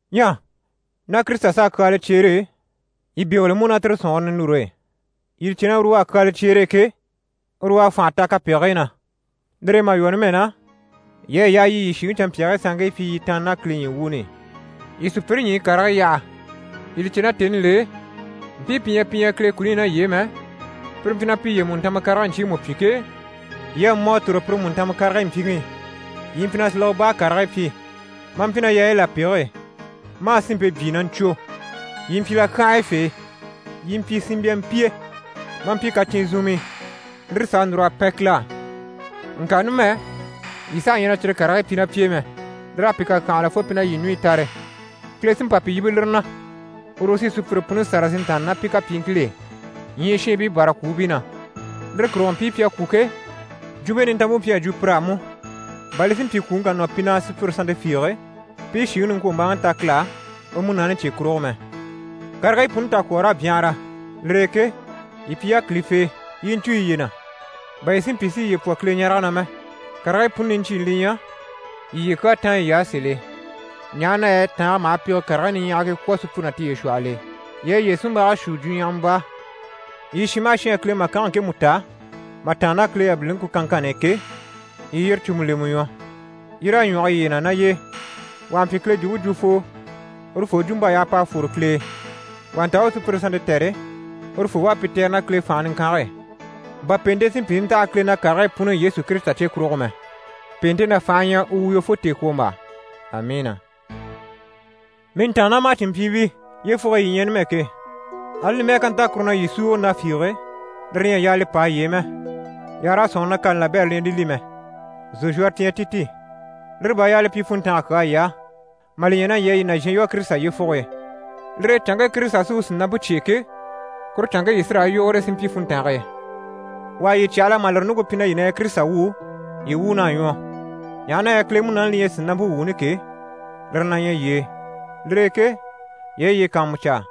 Ɲyɛ ná Kirisita s'à kyaala cyeere e, yii bégele mú ná tire sɔ̀nŋɔre ninure e. Yii li cè na uru u à kyaala cyeere e ke, uru u à fànha ta kapegigii na. Lire e mà lwɔ́ numɛ na, yii à yaa yii yii shìŋi canmpyaagii sanŋkii pyi yii tàanna ná Kile ɲyii wuuni i, yii sùpyire ɲyii karigii yaha. Yii li cè na tèni l'e, mpii pi ɲyɛ pi ɲyɛ Kile kuni i ná yii e mɛ, pire mpyi na piye mùntanma karigii ɲcyiimu pyi ke, yii à mɔ a tòro pire mùntanma karigii mpyiŋi i. Yii mpyi na silege baa karigii pyi, maa mpyi ná yaayi lapege e, maa sinmpe byii na ɲcwo, yii mpyi lakyanhayafee, yii mpyi sinmbyampiye, maa mpyi kacyinzunmii lire s'à núr'a pɛn Kile á. Ŋka numɛ, yii saha ɲyɛ na cyire kapegigii pyi ná pi e mɛ, lir'à pi kàkyanhala fo pi na yii ɲùɲyi tare. Kile sí n‑pa pi yíbe lire na. Uru u sí sùpyire puni sâra si ntàanna ná pi kapyiiŋkil'e, ɲyii shiinbii bâra kwùubii na. Lire kurugo mpii pi à kwû ke, Jwumpe Nintanmpe mpyi a jwo pir'á mú, bà li si mpyi kwùŋi ká nɔ pi na sùpyire sannte fiige, pi i shìŋi niŋkwombaaŋi ta Kile á, u Munaani cye kurugo mɛ. Karigii puni takwɔɔr'à byanhara, lire e ke, yii pyi yákilifee, yii i ɲcû yiye na, bà yii si mpyi si yiye pwɔ Kileɲarege na mɛ. Karigii puni niɲcyiini li ɲyɛ: yii yiye kyaa táan yiy'á sèl'e, ɲaha na yɛ tàange maha pege karigii niɲyahagii kwɔ̀ sùpyire ná tiye shwɔhɔl'e. Yii a yiye sunmbage shuu, jwuɲyahama baa. Yii shin maha shin à Kile màkange ŋkemu ta mà tàanna ná Kile yabiliŋi ku kanŋkanni i ke, yii yire cùmu lemɛ ɲwɔ, yii raa ɲwɔge yiye na ná y'e. Wà ha mpyi Kile jwumpe jwufoo, urufoo jwump'à yaa p'a fwore Kile e, wà ha nta u u sùpyire sannte tɛ̀re, urufoo u a pi tɛ̀re ná Kile fànhe niŋkange e, bà pèente si mpyi si ntaha Kile na karigii puni i Yesu Kirisita cye kurugo mɛ. Pèente ná fànhe ɲyɛ u woyo fo tèekwombaa. Amiina! Mii ntàannamacinmpyiibii, yyefuge e yii ɲyɛ numɛ ke, ali li mɛ́ɛ ká nta kuru na yii súuge na fiige, lire ɲyɛ a yaa li pâa yii e mɛ, yii àha raa sɔ̂nŋi na kani labɛrɛ li ɲyɛ li li mɛ. Zòzhwɔrɔ ti ɲyɛ ti ti. Lire bà à yaa li pyi funntanga kyaa yii á, mà li ɲya na yii à yii nàzhan lwɔ́ Kirisita yyefuge e. Lire e canŋke Kirisita sí u sìnampe cyêe ke, kuru canŋke yii sí raa yogore si mpyi funntange e. Wà ha yii cyahala mà lire ɲùŋke pyi na yii na ɲyɛ Kirisita wuu, yii wuun'à ɲwɔ, ɲaha na yɛ Kile Munaani li ɲyɛ sìnampe wuuni ke, lire na ɲyɛ ná yii e. Lire e ke yii a yiye kàanmucaa,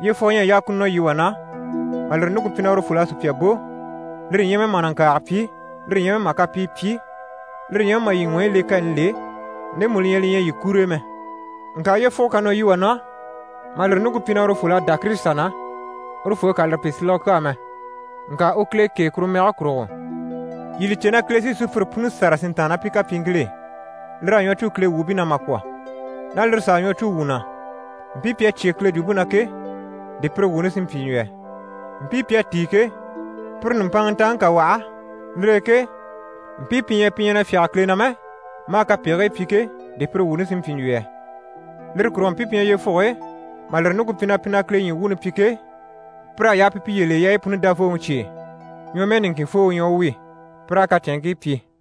yyefugo ɲyɛ a yaa ku nɔ yii wà na, mà lire ɲùŋke pyi na urufol'à sùpya bò, lire ɲyɛ mɛ mà nàŋkaaga pyi, lire ɲyɛ mɛ mà kapii pyi, lire ɲyɛ mɛ mà yii ɲwɔyi le kani l'e, ndemu li ɲyɛ li ɲyɛ yii kur'e mɛ. Ŋka yyefugo ká nɔ yii wà na, mà lire ɲùŋke pyi na urufol'à dá Kirisita na, urufoo ka lire pyi silege kyaa mɛ, ŋka u Kile kêe kuru mɛge kurugo. Yii li cè na Kile sí sùpyire puni sâra si ntàanna ná pi kapyiiŋkil'e, lir'à ɲwɔ cû Kile wuubii na mà kwɔ̀. Ná lire s'à ɲwɔ cû wuu na, mpii pi à cyé Kile jwumpe na ke, di pire sí n‑pyi n‑jwo yɛ? Mpii pi à tíi ke, pire nùmpanŋa ntaŋi ká waha, lire e ke, mpii pi ɲyɛ pi ɲyɛ na fyáge Kile na mɛ maa kapegigii pyi ke, di pire wuuni sí n‑pyi n‑jwo yɛ? Lire kurugo mpii pi ɲyɛ yyefuge e mà lire ɲùŋke pyi na pi na Kile ɲyii wuuni pyi ke, pir'à yaa pi piye le yaayi puni Davooŋi cye e, ɲwɔmɛɛ niŋkin foo u ɲyɛ u wi, pi raa kacɛnŋkii pyi.